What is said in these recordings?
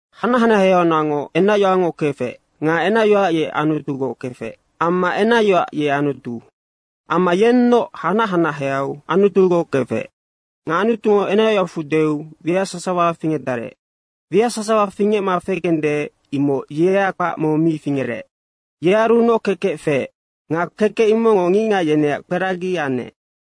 Hanac hanaheaunacngoc enacyoacngo kefec nga enacyoac ye Anutugoc kefec amma enacyoac ye Anutu. Amma yennoc hanac hanaheau Anutugoc kefec. Nga Anutungo enacyoacfu deu wiac sasawa fingecdarec, wiac sasawa fingecma fekende imoc yea kpac mong mi fingerec. Yearunoc kekec feec nga kekec imocngo ngicngac yeneac kperagi anec.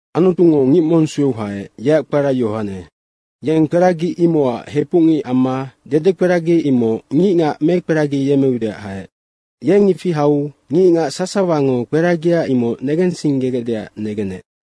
Anutungo ngic mong sueu haec, yeac kpara Yohane. Yeng kperagi imocac hepucngic amma dedekperagi imoc ngicngac mekperagiyemmeudeac haec. Yeng ifi hau ngicngac sasawango kperagia imoc negensinggegecdeac negenec.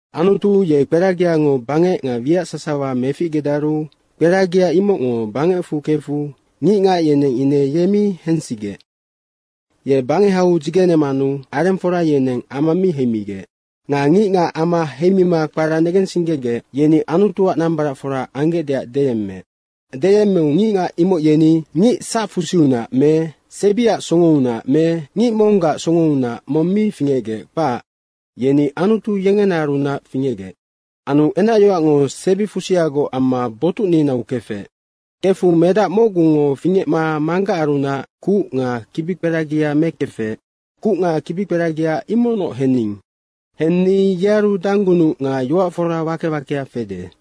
Anutu ye kperagiango bangec nga wiac sasawa meficgedaru kperagia imocngo bangecfu kefu ngicngac yeneng ine ye mi hensigec. Ye bangehau dzigenemanu arengfora yeneng ama mi heimigec. Nga ngicngac ama heimima kpara negensinggegec, yeni Anutuac nambaracfora anggecdeac deyemmeec. Deyemmeu ngicngac imoc yeni ngic sacfusiunac me sebiac songounac me ngic monggac songounac mong mi fingecgec, kpac. Yeni Anutu yengenaarunac fingecgec. Anu enacyoacngo sebifusiagoc amma botucninau kefec. Kefu medac mocgungo fingecma Manggacarunac kuc nga kibikperagia mekefec, kuc nga kibikperagia imocnoc hening. Henni yearu danggunuc nga yoac fora wake wakea fede.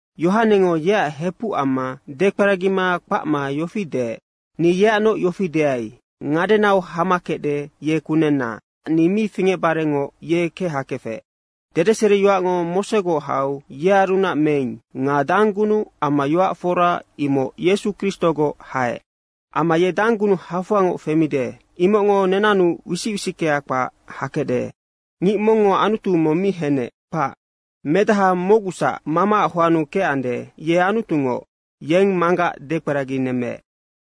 Yohanengo yeac hepuc amma dekperagima kpacma yofi deec, “Ni yeacnoc yofi deai, ngadenau hama kecde, ye kunenna, nocac ni mi fingecbarengoc ye kechakefec.” Dedeseriyoacngo Mosegoc hau yearunac meing nga danggunuc amma yoac fora imoc Yesu Kristogoc haec. Amma ye danggunuc hafoangoc femide, imocngo nenannu wisic wisickea kpac hakecde. Ngic mongngo Anutu mong mi henec, kpac. Medaha mocgusac Mamaac hoannu kecande, ye Anutungoc. Yeng Manggac dekperaginemmeec.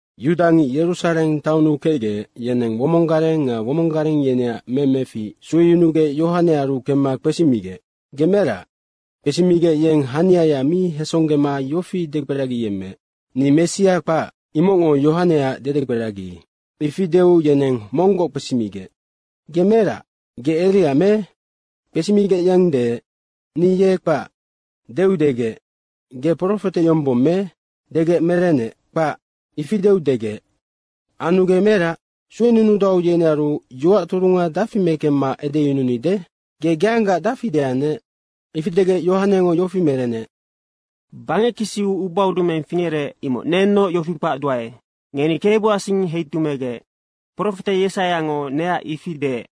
Yudangic Yerusareng taonnu kecgec, yeneng womong gareng nga womong gareng yeneac memefic sueyunugec Yohanearu kemma kpesimigec, “Ge merac?” kpesimigec, yeng haniaya mi hesonggema yofi dekperagiyemmeec, “Ni Messia kpac.” imocngo Yohaneac dedekperagi. Ifi deu yeneng monggoc kpesimigec, “Ge merac, ge Eria me?” kpesimigec yeng deec, “Ni ye kpac.” deu degec, “Ge profete yombong me?” degec merenec, “Kpac.” Ifi deu degec, “Anu ge merac? Suenunudau, yenearu yoac turunga dafi mekemma edeyununide? Ge geanggaac dafi deannec?” Ifi degec Yohanengo yofi merenec, “Bangec kisiu ubaudumeng fingerec imoc nennoc yofi kpacduae, ‘Ngeni KEBUAC sing heitumeigec.’ Profete Yesaiango neac ifi deec.”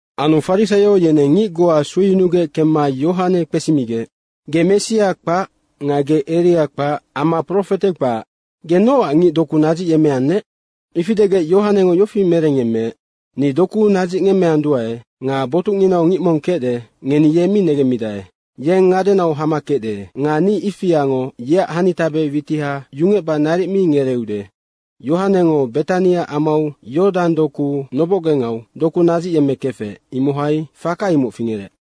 Anu farisaio yeneng ngic goa sueyunugec kemma Yohane kpesimigec, “Ge Messia kpac nga Eria kpac amma profete kpac. Ge nocac ngic doku nadzicyemmeannec?” Ifi degec Yohanengo yofi merengyemmeec, “Ni doku nadzicngemmeanduae. Nga botucnginau ngic mong kecde, ngeni ye mi negemmidae. Yeng ngadenau hama kecde nga ni ifiango yeac hanitabe witiha yungecba naric mi ngereeude.” Yohanengo Betania amau Yordang doku nobocgengau doku nadzicyemmekefec, imohai faka imoc fingerec.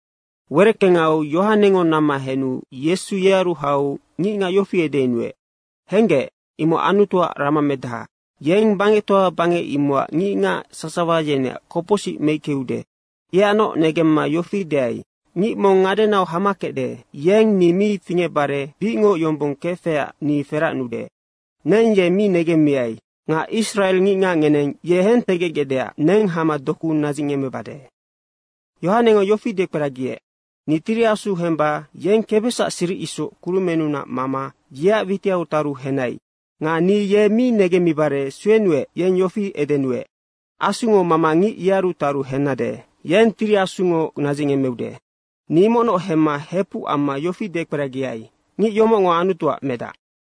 Wereckengau Yohanengo namma henu Yesungo yearu hau ngicngac yofi edeyunuec, “Henggec, imoc Anutuac ramamedaha, yeng bangectoa bangec imocac ngicngac sasawa yeneac kopocsic meickeude.” Yeacnoc negemma yofi deai, “Ngic mong ngadenau hama kecde, yeng ni mi fingecbare bicngoc yombong kefecac ni feracnude. Neng ye mi negemmiai. Nga israengicngac ngeneng ye hentegecgecdeac neng hama doku nadzicngemmebade.” Yohanengo yofi dekperagiec, “Ni Tiri Asu hemba yeng kebesacac siric isoc kurumennunac mama yeac witiau taru henai. Nga ni ye mi negemmibare suenuec, yeng yofi edenuec, ‘Asungo mama ngic yearu taru hennade, yeng Tiri Asungo nadzicngemmeude.’ Ni imocnoc hemma hepuc amma yofi dekperagiai, ngic yomocngo Anutuac medac.”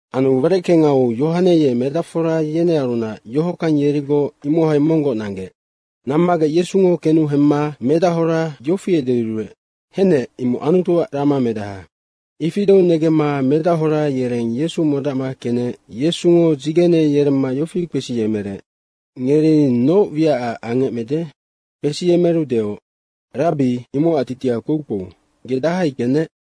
Anu wereckengau Yohane ye medacfora yenearunac yohockang yerigoc imohai monggoc nanggec. Nammagec Yesungo kenu hemma medahora yofi edeyuruec, “Henec, imoc Anutuac ramamedaha.” Ifi deu negemma medahora yereng Yesu modacma kenec Yesungo dzigene yeremma yofi kpesiyemerec, “Ngeri noc wiacac angecmede?” kpesiyemeru deoc, “Rabbi, (imocac titiha kpoukpou) ge dahai kecnec?”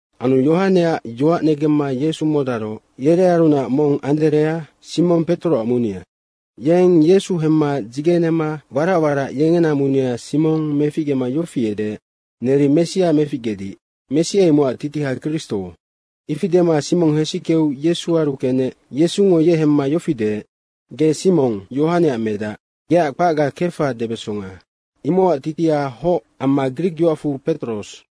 Anu Yohaneac yoac negemma Yesu modaroc, yerearunac mong Anderea, Simong Petoroac munea. Yeng Yesu hemma dzigenema warac warac yengena munea Simong meficgema yofi edeec, “Neri Messia meficgedic.” (Messia imocac titiha Kristo.) Ifi dema Simong hesickeu Yesuaru kenec Yesungo ye hemma yofi deec, “Ge Simong Yohaneac medac, geac kpacga Kefa debesonga.” (Imocac titiha hoc amma grikyoacfu Petros.)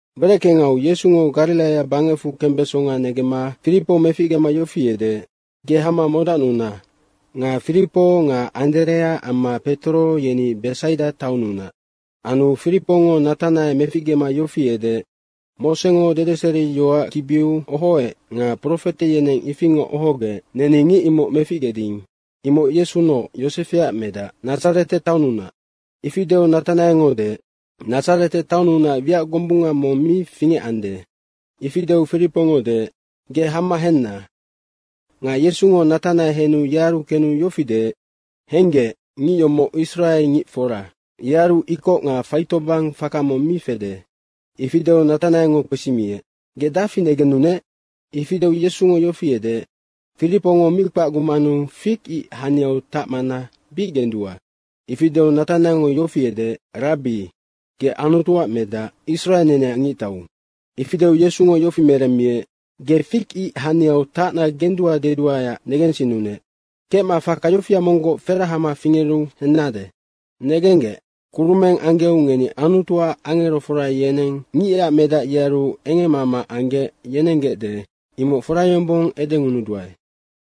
Wereckengau Yesungo Gariraia bangecfu kembesonga negemma Firipo meficgema yofi edeec, “Ge hama modacnuna.” Nga Firipo nga Anderea amma Petoro yeni Besaida taonnunac. Anu Firipongo Natanae meficgema yofi edeec, “Mosengo dedeseriyoac kibiu ohoec nga profete yeneng ifingoc ohogec, neni ngic imoc meficgeding. Imoc Yesunoc, Yosefeac medac, Nadzarete taonnunac.” Ifi deu Natanaengo deec, “Nadzarete taonnunac wiac gombunga mong mi fingecande.” ifi deu Firipongo deec, “Ge hama henna.” Nga Yesungo Natanae henu yearu kenu yofi deec, “Henggec, ngic yomoc israengic fora, yearu ikoc nga faitobang faka mong mi fede.” Ifi deu Natanaengo kpesimiec, “Ge dafi negennunec?” Ifi deu Yesungo yofi edeec, “Firipongo mi kpacgumanu fig ic haniau tacmana bic gendua.” Ifi deu Natanaengo yofi edeec, “Rabbi, ge Anutuac medac, Israe neneac Ngictau.” Ifi deu Yesungo yofi meremmiec, “Ge fig ic haniau tacna gendua deduaeac negensinnunec. Kecma faka yofia monggoc ferahema fingeru hennade. Negenggec, kurumeng anggeu ngeni Anutuac angerofora yeneng Ngicac Medac yearu engemmama anggec yenenggecde, imoc fora yombong edengunuduae.”